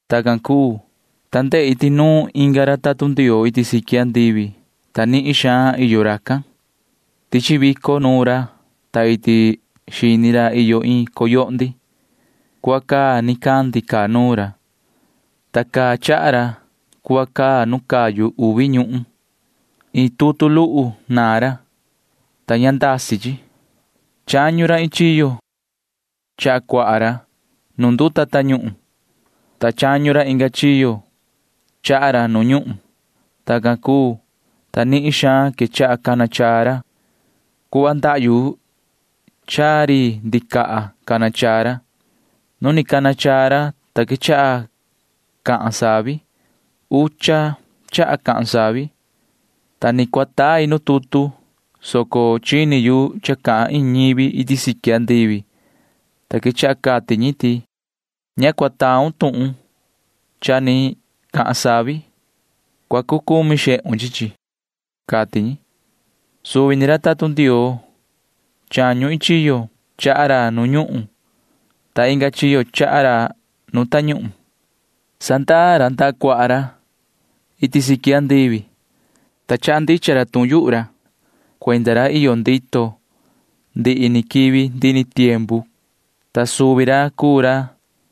Tacan cuu, ta ndehi ti nuun inga ra tatun Ndioo iti siqui andivi, ta nihin xaan iyo racan. Tichi vico nuun ra, ta iti xini ra iyo iin coyohndi. Cuhva caa nicandi caa nuun ra, ta caa chaha ra cuhva nu cayu uvi ñuhun. Iin tutu luhu naan ra, ta ña ndasi chi. Chañu ra iin chiyo chaha cuaha ra nu nduta tañuhun, ta chañu ra inga chiyo chaha ra nu ñuhun. Tacan cuu, ta nihin xaan quechaha cana chaa ra. Cuhva ndahyu chaa ri ndicaha cana chaa ra. Nu ni cana chaa ra, ta quechaha cahan savi. Ucha chaha cahan savi, ta ni cua tai nu tutu, soco chini yu cha cahan iin ñivi iti siqui andivi, ta quechaha cati ñi ti: ―Ña cua taun tuhun cha ni cahan savi. Cua cucumi xehun chi chi ―cati ñi. Suvi ni ra tatun Ndioo chañu iin chiyo chaha ra nu ñuhun ta inga chiyo chaha ra nu tañuhun―sandaa ndaha cuaha ra nda iti siqui andivi, ta quechaha cahan ra iin cha rai ndicha. Cuenda ra iyo ndito ndihi ni quivi ndihi ni tiempu cahan rai ra, ta suvi ra cuu ra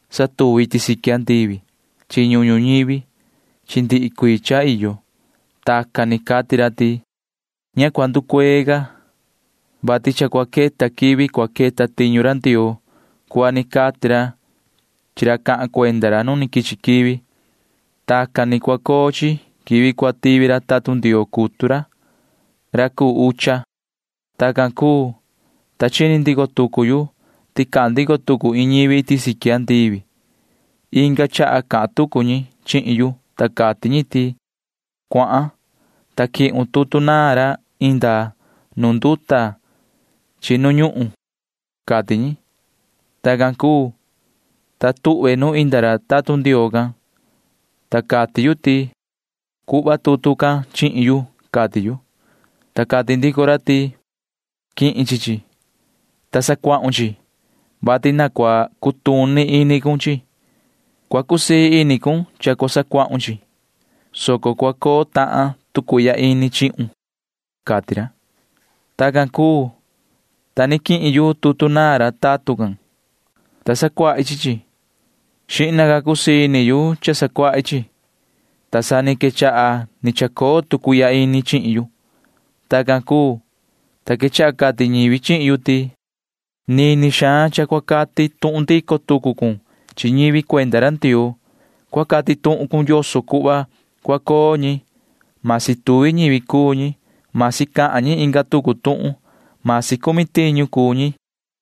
satuvi iti siqui andivi chi ñuhun ñuñivi chi ndihi cuii cha iyo. Tacan ni cati ra ti: ―Ña cua nducuee ca, vati cha cua queta quivi cua queta tiñu ra Ndioo cuhva ni cati ra chi ra cahan cuenda ra nu ni quichi quivi. Tacan ni cua coo chi quivi cua tivi ra tatun Ndioo cutu ra, ra cuu ucha. Tacan cuu, ta chini ndico tucu yu ti cahan ndico tucu iin ñivi iti siqui andivi. Inga chaha cahan tucu ñi chihin yu, ta cati ñi ti: ―Cuahan, ta quihun tutu naan ra inda nu nduta chi nu ñuhun ―cati ñi. Tacan cuu, ta tuhve nu inda ra tatun Ndioo can, ta cati yu ti: ―Cuhva tutu can chihin yu ―cati yu. Ta cati ndico ra ti: ―Quihin chi chi, ta sacuahun chi chi, vati na cua cutuni ini cun chi chi. Cua cusii ini cun cha cua sacuahun chi chi, soco cua coo tahan tu cuihya ini chihun ―cati ra. Tacan cuu, ta ni quihin yu tutu naan ra tatun can, ta sacuahi chi chi. Xihna ca cusii ini yu cha sacuahi chi chi, ta sa ni quechaha ni chacoo tu cuihya ini chihin yu. Tacan cuu, ta quechaha cati ñivi chihin yu ti: ―Nini xaan cha cua cati tuhun ndico tucu cun chi ñivi cuenda ra Ndioo. Cua cati tuhun cun yoso cuhva cua coo ñi―masi tuvi ñivi cuu ñi, masi cahan ñi inga tucu tuhun, masi cumi tiñu cuu ñi ―cati ñi.